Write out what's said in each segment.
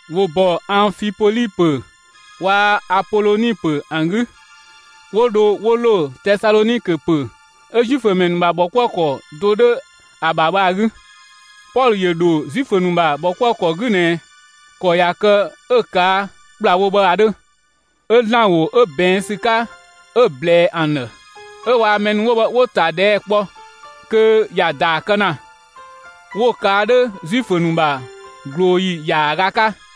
‑Wo ‑bɔ Anfipoli ‑pö waa‑ Apoloni ‑pö ‑an 'gü, 'wo dho 'wo ‑lo Tesalɔnikö ‑pö 'ö Zuifö ‑mɛ ‑nu ‑bha ‑bhɔkuëkɔ do 'dhö ‑a ‑bha bhë ‑a 'gü. Pɔlö ‑yö ‑dho Zuifö ‑nu ‑bha ‑bhɔkuëkɔ 'gü ꞊nɛ ‑kɔ ꞊ya kë 'ö‑ ꞊kaa' ‑kplawo bhë ‑a 'dhö. 'Ö ‑Zlan ‑wo 'ö ꞊bɛɛn' ‑sü 'ka, 'ö‑ ꞊blɛɛ ‑an ‑dhë, 'ö waa‑ mɛ ‑nu 'wo bhë 'wo‑ ‑ta ꞊dhɛɛ' kpɔ, kö ‑ya ‑daa kë ‑na; 'wo‑ ꞊kaa' 'dhö Zuifö ‑nu ‑bha ꞊glooyi ‑yaaga 'ka.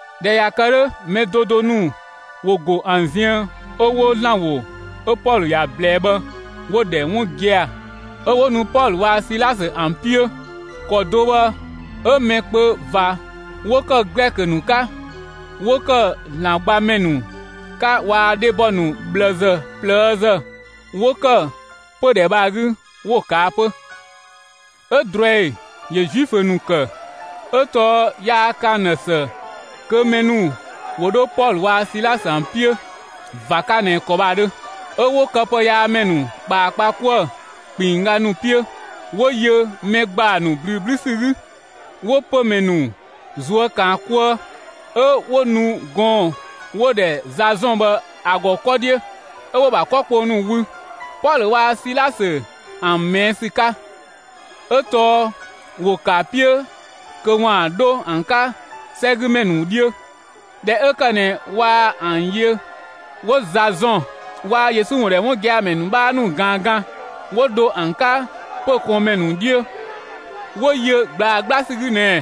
꞊Dhɛ ꞊ya kë 'dhö, mɛ do do ‑nu ‑wo go ‑an ziën 'ö 'wo ‑Zlan ‑wo 'ö Pɔlö ‑ya ꞊blɛɛ bhë 'wo‑ ‑dhɛ 'wun gia‑; 'ö 'wo nu Pɔlö waa‑ Silasö ‑an 'piö. ‑Kɔ do bhë 'ö mɛ kpö ꞊va 'wo ‑kë Glɛkö ‑nu 'ka, 'wo ‑kë ‑Zlan gbamɛ ‑nu 'ka waa‑ dhebɔ ‑nu ꞊bhlëzë ꞊plëëzë 'wo ‑kë pödhɛ bhë ‑a 'gü 'wo‑ ꞊kaa' 'pö. 'Ö ꞊druɛi ‑yö Zuifö ‑nu ‑kë, 'ö tɔɔ yaa ‑kë ‑an ‑dhë ‑së kö mɛ ‑nu ‑wo 'dho Pɔlö waa‑ Silasö ‑an 'piö ꞊va 'ka ꞊nɛ ‑kɔ bhë ‑a 'dhö. 'Ö 'wo këpëyaamɛ ‑nu ꞊kpaa kpa 'kuë‑ ‑kpinngga ‑nu 'piö, 'wo yö mɛ ‑gbaa ‑nu ꞊blüü 'blü ‑sü 'gü, 'wo pömɛ ‑nu ꞊zuö' ‑kan 'kuë. 'Ö 'wo nu gɔɔn‑ 'wo‑ ‑dhɛ Zazɔn bhë ‑a ‑gɔ 'kɔ 'dhiö, 'ö 'wo‑ ‑bha 'kɔ kpong ‑nu wü, Pɔlö waa‑ Silasö ‑an ꞊mɛɛ' ‑sü 'ka, 'ö tɔɔ ‑wo ‑kë ‑a 'piö kö 'waan‑ 'dho ‑an 'ka 'sɛgümɛ ‑nu 'dhiö. ꞊Dhɛ 'ö ‑kë ꞊nɛ waa ‑an yö, 'wo Zazɔn waa‑ Yesu ‑wun ‑dhɛ 'wun gia‑ ‑mɛ ‑nu 'bhaa ‑nu ꞊gaan 'gan, 'wo dho ‑an 'ka pö‑ ꞊kɔɔnmɛ ‑nu 'dhiö. 'Wo yö ꞊gblaa 'gbla ‑sü 'gü ꞊nɛɛ: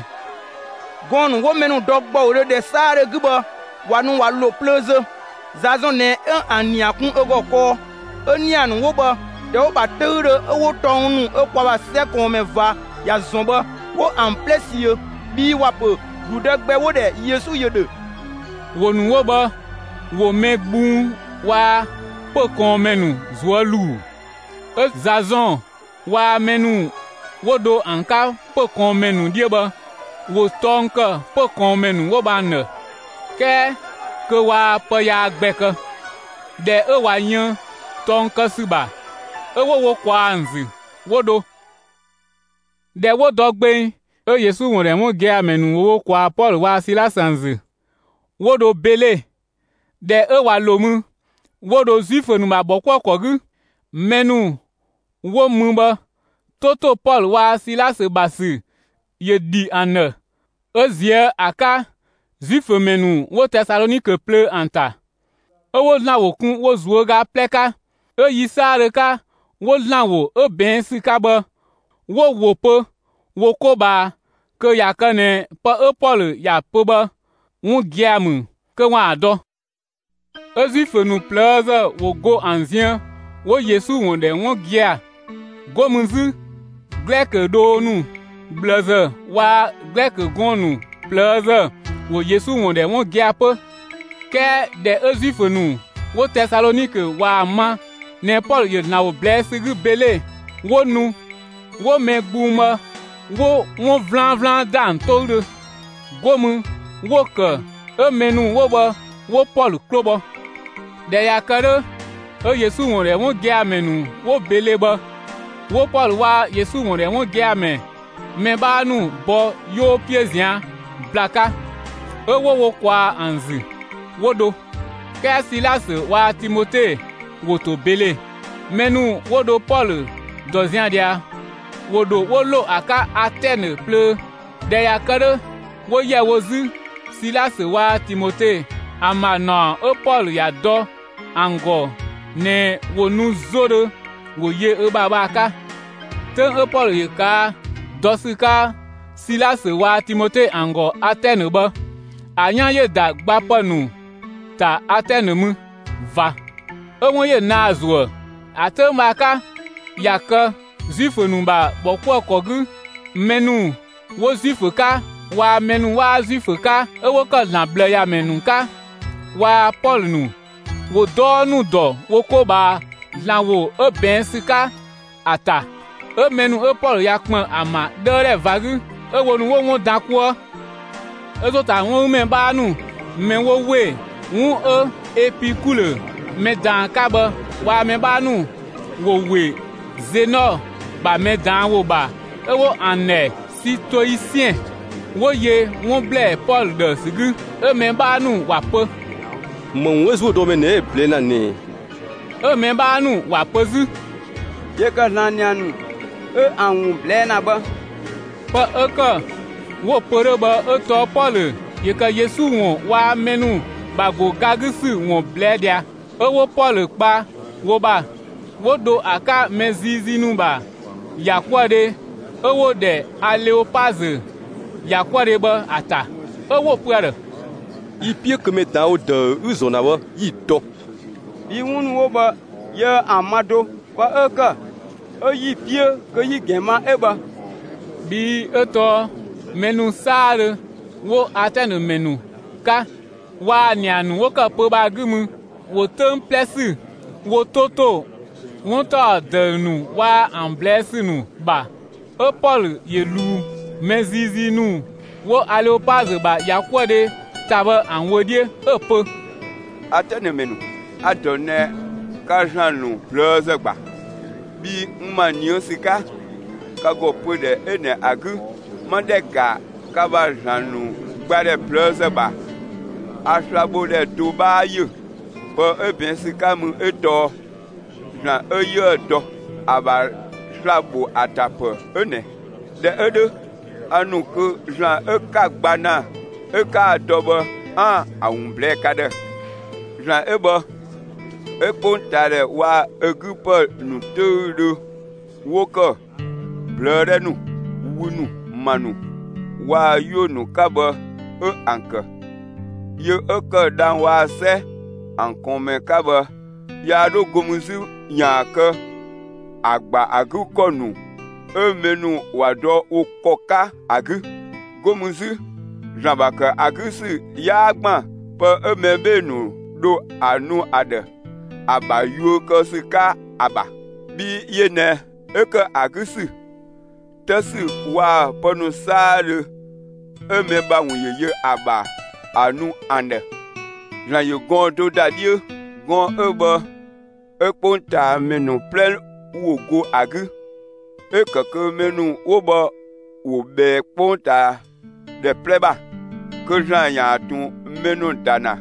«Gɔɔn‑ ‑nu 'wo mɛ ‑nu dɔ ‑gbɔudhö, ‑dhɛ 'saadhö 'gü bhë ꞊wa nu ꞊wa ‑lo plöö zö! Zazɔn ꞊nɛ 'ö ‑an ‑nia kun ö ‑gɔ kɔɔ! 'ö‑ ‑nia ‑nu 'wo bhë, ‑dhɛ 'wo‑ ‑bha 'töüdhö 'ö 'wo tɔng ‑nu 'ö kwa ‑bha 'sɛ ꞊kɔɔnmɛ ꞊va ‑ya ‑zɔn bhë 'wo ‑an 'plɛ ꞊siö, bhii ‑wa ‑pö ‑gludë gbɛ 'wo‑ ‑dhɛ Yesu ‑yö ‑dhö!» ‑Wo ‑nu 'wo bhë ‑wo mɛ gbung waa‑ pö‑ ꞊kɔɔnmɛ ‑nu ꞊zuö' ‑luu. 'Ö Zazɔn waa‑ mɛ ‑nu 'wo dho ‑an 'ka pö‑ ꞊kɔɔnmɛ ‑nu 'dhiö bhë, 'wo tɔng ‑kë pö‑ ꞊kɔɔnmɛ ‑nu 'wo bhë ‑an ‑dhë, 'kɛɛ kö waa pë yaa gbɛ kë. ꞊Dhɛ 'ö ꞊wa yën tɔng kë ‑sü ‑bha 'ö 'wo wo ꞊kwaa ‑an ‑zü, 'wo dho. ꞊Dhɛ 'wo dɔ gbeng 'ö Yesu ‑wun ‑dhɛ 'wun gia‑ ‑mɛ ‑nu ‑wo wo ‑kwaa Pɔlö waa‑ Silasö ‑an ‑zü, 'wo dho Bele. ꞊Dhɛ 'ö ꞊wa ‑lo mü, 'wo dho Zuifö ‑nu ‑bha ‑bhɔkuëkɔ 'gü. Mɛ ‑nu 'wo mü bhë 'to ‑to Pɔlö waa‑ Silasö ‑bha ‑sü ‑yö ‑dhi ‑an ‑dhë, 'ö ꞊ziö' ‑a 'ka Zuifö ‑mɛ ‑nu 'wo Tesalɔnikö plöö ‑an ‑ta. 'Ö 'wo ‑Zlan ‑wo kun wo ꞊zuöga 'plɛ 'ka. 'Ö yi 'saadhö 'ka, 'wo ‑Zlan ‑wo 'ö ꞊bɛɛn' ‑sü 'ka bhë 'wo‑ ‑wo pö wo 'ko ꞊bhaa kö ꞊ya kë ꞊nɛ pë 'ö Pɔlö ‑ya pö bhë 'wun gia‑ ‑mü, kö 'waan‑ ‑a dɔ. 'Ö Zuifö ‑nu ꞊plëëzë ‑wo go ‑an ziën 'wo Yesu ‑wun ‑dhɛ 'wun gia‑. 'Go mü 'zü Glɛkö dhoo ‑nu ꞊bhlëzë waa‑ Glɛkö gɔɔn‑ ‑nu ꞊plëëzë ‑wo Yesu ‑wun ‑dhɛ 'wun gia‑ 'pö. 'Kɛɛ ꞊dhɛ 'ö Zuifö ‑nu 'wo Tesalɔnikö ꞊waa‑ ma ꞊nɛ Pɔlö ‑yö ‑Zlan ‑wo ꞊blɛɛ' ‑sü 'gü Bele, 'wo nu 'wo mɛ gbung bhë 'wo 'wun 'vlanvlan ‑da ‑an 'toüdhö. 'Go mü 'wo‑ ‑kë 'ö mɛ ‑nu 'wo bhë 'wo Pɔlö 'klo bhɔ. ꞊Dhɛ ꞊ya kë 'dhö, 'ö Yesu ‑wun ‑dhɛ 'wun gia‑ ‑mɛ ‑nu 'wo Bele bhë, 'wo Pɔlö waa‑ Yesu ‑wun ‑dhɛ 'wun gia‑ ‑mɛ 'bhaa ‑nu bɔ 'yoo 'piö ꞊zian' ‑bla 'ka, 'ö 'wo wo ꞊kwaa'‑ ‑an ‑zü 'wo dho. 'Kɛɛ Silasö waa‑ Timote ‑wo ‑to Bele. Mɛ ‑nu 'wo dho Pɔlö ‑dɔ zian‑ ꞊dhia, ‑wo ‑dho 'wo ‑lo ‑a 'ka Atɛnë plöö. ꞊Dhɛ ꞊ya kë 'dhö, 'wo ‑yɛ wo 'zü Silasö waa‑ Timote ‑an ‑bha ‑naɔ 'ö Pɔlö ‑ya dɔ ‑an ‑gɔ ꞊nɛɛ, ‑wo nu 'zodhö, ‑wo yö ö ‑bha bhë ‑a 'ka. 'Töng 'ö Pɔlö ‑yö ꞊kaa' dɔ ‑sü 'ka Silasö waa‑ Timote ‑an ‑gɔ Atɛnë bhë, ‑a 'yan ‑yö ‑da gbapë ‑nu ‑ta Atɛnë mü ꞊va; 'ö 'wun ‑yö naa‑ ‑zuë. ‑A 'töng bhë ‑a 'ka, ꞊ya kë Zuifö ‑nu ‑bha ‑bhɔkuëkɔ 'gü, mɛ ‑nu 'wo Zuifö 'ka waa‑ mɛ ‑nu 'waa Zuifö 'ka 'ö 'wo ‑kë ‑Zlan ꞊bhlëyamɛ ‑nu 'ka waa‑ Pɔlö ‑nu, ‑wo 'dɔɔ ‑nu ‑dɔ wo 'ko ꞊bhaa ‑Zlan ‑wo 'ö ꞊bɛɛn' ‑sü 'ka ‑a ‑ta. 'Ö mɛ ‑nu 'ö Pɔlö ꞊ya ‑kpën ‑an ‑bha 'dhëëdhɛ ꞊va 'gü, 'ö wo ‑nu 'wo 'wun dan 'kuë. 'Ö ‑zo ‑ta 'wun 'gü ‑mɛ 'bhaa ‑nu mɛ 'wo ‑we 'wun 'ö Epikulö mɛ ꞊daan ‑a 'ka bhë waa‑ mɛ 'bhaa ‑nu 'wo ‑we Zenɔ ‑bha mɛ ꞊daan' ‑wo ‑bha 'ö 'wo ‑an ‑dhɛ Sitoisiɛn, 'wo yö 'wun ‑blɛɛ Pɔlö ‑dhë ‑sü 'gü. 'ö‑ mɛ 'bhaa ‑nu ‑wa pö: «‑Më ‑wun 'ö ‑zuödɔmɛ 'ö ꞊nɛ 'ö‑ ꞊blɛɛ' ‑na ꞊nɛ ꞊ɛ?» 'ö‑ mɛ 'bhaa ‑nu ‑wa pö 'zü: «‑Yö ‑kë ‑Zlan ‑nia ‑nu 'ö ‑an ‑wun ꞊blɛɛ' ‑na bhë.» Pë 'ö ‑kë 'wo‑ pö 'dhö bhë 'ö tɔɔ Pɔlö ‑yö ‑kë Yesu ‑wun waa‑ mɛ ‑nu ‑bha ‑go ga 'gü ‑sü ‑wun ꞊blɛɛ' ꞊dhia. 'Ö 'wo Pɔlö kpa wo ‑bha, 'wo dho ‑a 'ka mɛ ziizii ‑nu ‑bha ‑yakuëdhe 'ö 'wo‑ ‑dhɛ Aleopazö ‑yakuëdhe bhë ‑a ‑ta. 'Ö 'wo‑ pö ‑a ‑dhë: «Yi‑ 'piö kö mɛ ꞊daan' ‑wo ‑dëü 'ü‑ ‑zɔn ‑na bhë 'yi‑ dɔ. Bhii 'wun ‑nu 'wo bhë yiëë ‑an ma do. Pë 'ö ‑kë 'ö 'yi‑ 'piö kö yi‑ ‑gɛn ma 'ö bhë.» Bhii 'ö tɔɔ mɛ ‑nu 'saadhö 'wo Atɛnë ‑mɛ ‑nu 'ka waa‑ ‑nia ‑nu 'wo ‑kë pö‑ bhë ‑a 'gü mü, ‑wo 'töng 'plɛ ‑sü wo 'to ‑to 'wun ‑taɔ ‑dëü ‑nu waa‑ ‑an ꞊blɛɛ' ‑sü ‑nu ‑bha. 'Ö Pɔlö ‑yö ꞊luu mɛ ziizii ‑nu 'wo Aleopazö ‑bha ‑yakuëdhe ‑ta bhë ‑an wö 'dhiö, 'ö‑ pö: «Atɛnë ‑mɛ ‑nu, a‑ ‑dɔ ꞊nɛ, ka ‑zlan ‑nu ꞊plëëzë ‑gba. Bhii n ‑ma ꞊nië' ‑sü 'ka, ka ‑gɔ pödhɛ 'ö ꞊nɛ ‑a 'gü, 'ma ‑dhɛ ‑ga ka ‑bha ‑Zlan ‑nu gbadhɛ ꞊plëëzë ‑bha; a slabhodhɛ do 'bhaa ‑yö. Pë 'ö ꞊bɛɛn' ‑sü 'ka mü 'ö tɔɔ: ‹‑Zlan 'ö 'yiëë‑ dɔ, ‑a ‑bha sla‑ ‑bho ‑a ‑ta ‑pë 'ö ꞊nɛ.› ꞊Dhɛ 'ö 'dhö, a ‑nu kö ‑Zlan 'ö 'ka‑ gba ‑na 'ö 'kaa‑ dɔ bhë 'aan‑ ‑a ‑wun ꞊blɛɛ'‑ ka ‑dhë. ‑Zlan 'ö bhë 'ö 'kpongtaadhɛ waa‑ ö 'gü ‑pë ‑nu 'töüdhö 'wo ‑kë ꞊blëë' 'dhɛ ‑nu, wü ‑nu, ‑ma ‑nu waa‑ 'yuö‑ ‑nu 'ka bhë 'ö ‑an ‑kë. Yö 'ö ‑kë dhang‑ waa‑ 'sɛ ‑an ꞊kɔɔnmɛ 'ka bhë yaa 'dho 'go mü 'zü ‑yaan kë ‑a ‑gba ‑a 'gü ‑kɔ ‑nu 'ö mɛ ‑nu ‑wa dɔ wo ‑kɔ 'ka ‑a 'gü. 'Go mü 'zü, ‑Zlan ‑bha ‑kë ‑a 'gü ‑sü 'yaa ‑gban pë 'ö mɛ 'bhee‑ ‑nu dho ‑a nu ‑a ‑dhë, ‑a ‑bha yuö kë ‑sü 'ka ‑a ‑bha. Bhii yö ꞊nɛ 'ö ‑kë ‑a 'gü ‑sü, 'të ‑sü waa‑ pë ‑nu 'saadhö 'ö mɛ ‑bha ‑wun ‑yö yö ‑a ‑bha ‑a nu ‑an ‑dhë. ‑Zlan ‑yö gɔɔn‑ do ‑da 'dhiö. Gɔɔn‑ 'ö bhë 'ö 'kpongtaamɛ ‑nu 'plɛ ‑wo go ‑a 'gü, 'ö‑ ‑kë kö mɛ ‑nu 'wo bhë ‑wo ꞊bhɛɛ 'kpongtaadhɛ 'plɛ ‑bha. Kö ‑Zlan ‑yaan ꞊tun mɛ ‑nu ‑da ‑na,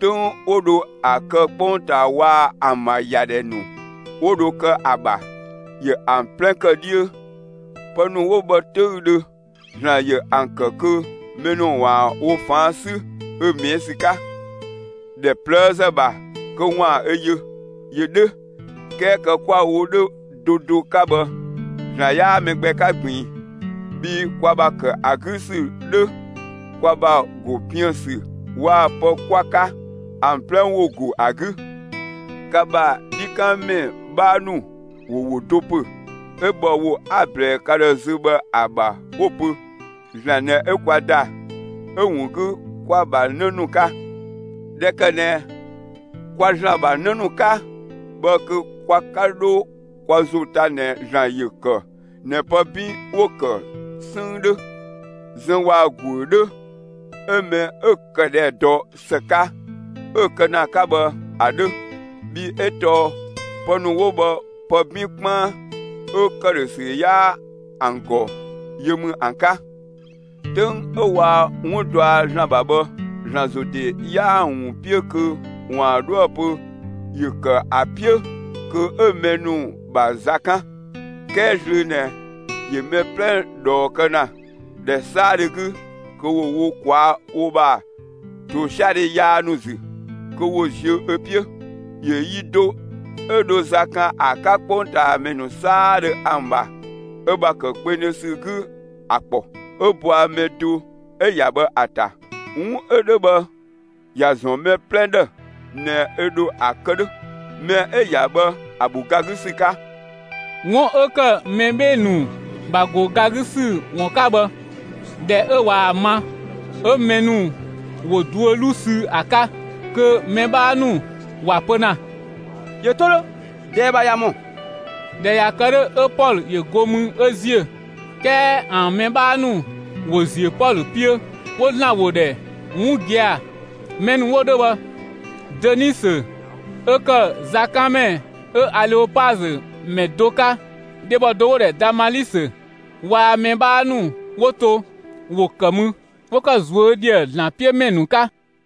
'töng 'wo dho ‑a kë 'kpongtaa waa‑ ‑an ‑bha ‑yadhɛ ‑nu 'wo dho kë ‑a ‑bha, ‑yö ‑an 'plɛ ‑kë 'dhiö. Pë ‑nu 'wo bhë 'töüdhö ‑Zlan ‑yö ‑an ‑kë kö mɛ ‑nu ‑waan wo ꞊faan' 'sü ö ꞊mɛɛ' ‑sü 'ka, ‑dhɛ ꞊plëëzë ‑bha kö ‑waan ö yö. ‑Yö 'dhö, 'kɛɛ kë 'kwa‑ wo 'dhö do do 'ka bhë ‑Zlan 'yaa mɛ gbɛ 'ka ꞊gbiin. Bhii kwa ‑bha ‑kë ‑a 'gü ‑sü 'dhö, kwa ‑bha ‑go piën‑ ‑sü waa‑ pë 'kwa‑ 'ka, ‑an 'plɛ ‑wo ‑go ‑a 'gü. Ka ‑bha 'dhikanmɛ 'bhaa ‑nu ‑wo ‑wo do ‑pö, 'ö bhɔ ‑wo 'a‑ ꞊blɛɛ ka ‑dhë zö bhë ‑a ‑bha 'wo‑ pö: ‹‑Zlan ꞊nɛ 'ö kwa ‑da, 'ö‑ ‑wun 'gü 'kwa‑ ‑bha 'në ‑nu 'ka.› ꞊Dhɛ ‑kë ꞊nɛ, kwa ‑Zlan ‑bha 'në ‑nu 'ka bhë kö kwa 'ka 'dho kwa ‑zo ta ꞊nɛ ‑Zlan ‑yö ‑kë ꞊nɛ pë 'bin 'wo‑ ‑kë 'sënng 'dhö, zëng waa‑ ‑guö 'dhö 'ö mɛ 'ö‑ këdhɛ dɔ ‑së 'ka 'ö‑ kë ‑na 'ka bhë ‑a 'dhö. Bhii 'ö tɔɔ pë ‑nu 'wo bhë pë 'bin 'kpaan 'ö ‑këdhösü 'yaa ‑an ‑gɔ yö ‑mü ‑an 'ka. 'Töng 'ö waa 'wun dɔa ‑Zlan ‑bha bhë, ‑Zlan ‑zo ‑de 'yaa‑ ‑wun 'piö kö ‑waan 'dhoë‑ pö ‑yö ‑kë ‑a 'piö kö 'ö mɛ ‑nu ‑bha za 'kan. 'Kɛɛ zlöö ꞊nɛ ‑yö mɛ 'plɛ ꞊dhɔɔ kë ‑na, ‑dhɛ 'saadhö 'gü kö ‑wo wo ꞊kwaa'‑ wo ‑bha ‑tosiadhe yaa ‑nu ‑zü, kö ‑wo ziö ö 'piö. ‑Yö yi do 'ö dho za kan ‑a 'ka 'kpongtaamɛ 'saadhö ‑an ‑bha ö ‑bha ‑kë kpengdhö ‑sü 'gü ‑a ‑kpɔ, 'ö bɔa mɛ do 'ö‑ ‑ya bhë ‑a ‑ta. 'Wun 'ö 'dhö bhë ‑ya ‑zɔn mɛ 'plɛ ‑dhë ꞊nɛ ö ‑dho ‑a kë 'dhö, mɛ 'ö‑ ‑ya bhë ‑a ‑bho ga 'gü ‑sü 'ka.» 'Wun 'ö ‑kë mɛ 'bhee‑ ‑nu ‑bha ‑go ga 'gü ‑sü ‑wun 'ka bhë, ꞊dhɛ 'ö ꞊waa‑ ma, 'ö mɛ ‑nu ‑wo duö 'luu sü ‑a 'ka, kö mɛ 'bhaa ‑nu ‑wa pö ‑na: «‑Yö 'to 'dhö; ꞊dɛɛ ‑bha ꞊ya ‑mɔ!» ꞊Dhɛ ꞊ya kë 'dhö, 'ö Pɔlö ‑yö go mü 'ö ‑ziö. 'Kɛɛ ‑an mɛ 'bhaa ‑nu ‑wo ‑ziö Pɔlö 'piö, 'wo ‑Zlan ‑wo ‑dhɛ 'wun gia‑. Mɛ ‑nu 'wo 'dhö bhë, Dönisö 'ö ‑kë zakanmɛ 'ö Aleopazö ‑mɛ do 'ka, dhebɔ do 'wo‑ ‑dhɛ Damalisö waa‑ mɛ 'bhaa ‑nu 'wo to, ‑wo ‑kë mü 'wo ‑kë ꞊zuö' ‑dhië ‑Zlan 'piö ‑mɛ ‑nu 'ka.